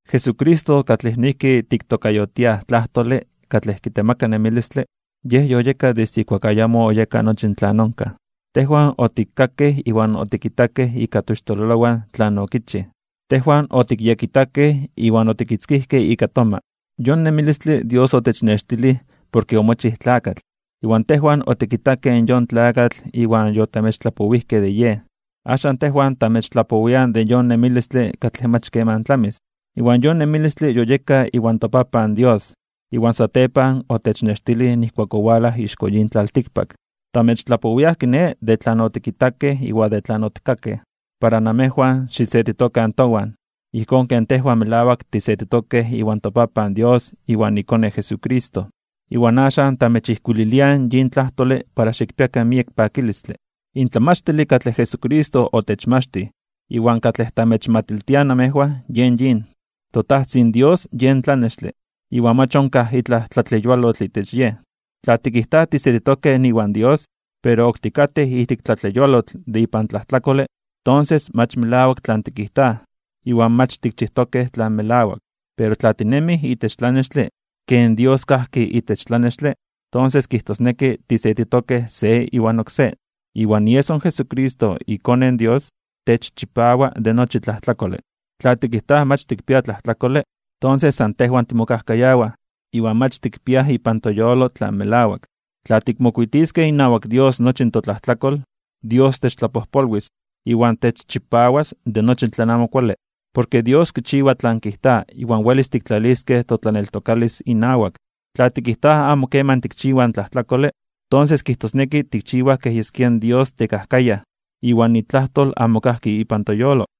Jesucristo katlej noijki tiktokayotiaj Tlajtole katlej kitemaka nemilistle, Yej yoyeka desde ijkuak ayamo oyeka nochi tlan onkaj. Tejwan otikkakej iwan otikitakej ika toixtololowan tlan okichij. Tejwan otikyekitakej iwan otikitzkijkej ika toma. Yon nemilistle Dios otechnextilij, porke omochij Tlakatl. Iwan tejwan otikitakej yon Tlakatl iwan yotamechtlapowijkej de Yej. Axan, tejwan tamechtlapowiaj de yon nemilistle katlej mach keman tlamis, iwan yon nemilistle yoyeka iwan toPapan Dios, iwan satepan otechnextilij nijkuak owalaj ixko yin tlaltikpak. Tamechtlapowiaj, kiné, de tlan otikitakej iwan de tlan otikkakej, para namejwan xisetitokan towan, ijkón ken tejwan melawak tisetitokej iwan toPapan Dios iwan iKone Jesucristo. Iwan axan tamechijkuililiaj yin tlajtole para xikpiakan miek pakilistle. In tlamachtile katlej Jesucristo otechmachtij iwan katlej tamechmatiltiaj namejwan yen yin: toTajtzin Dios yen tlanextle, iwan mach onkaj itlaj tlatleyualotl itech Yej. Tla tikijtaj tisetitokej iwan Dios, pero ok tikatej ijtik tlatleyualotl de ipan tlajtlakole, tonses mach melawak tlan tikijtaj iwan mach tikchijtokej tlan melawak. Pero tla tinemij itech tlanextle, ken Dios kajki itech tlanextle, tonses kijtosneki tisetitokej se iwan oksé, iwan ieso in Jesucristo, iKone in Dios, techchipawa de nochi tlajtlakole. Tla tikijtaj mach tikpiaj tlajtlakole, tonses san tejwan timokajkayawaj iwan mach tikpiaj ipan toyolo tlan melawak. Tla tikmokuitiskej inawak Dios nochi totlajtlakol, Dios techtlapojpolwis, iwan techchipawas de nochi tlan amo kuale. Porke Dios kichiwa tlan kijta iwan welis tiktlaliskej totlaneltokalis inawak. Tla tikijtaj amo keman tikchiwaj tlajtlakole, tonses kijtosneki tikchiwaj kej yeskia in Dios tekajkayaj, iwan itlajtol amo kajki ipan toyolo.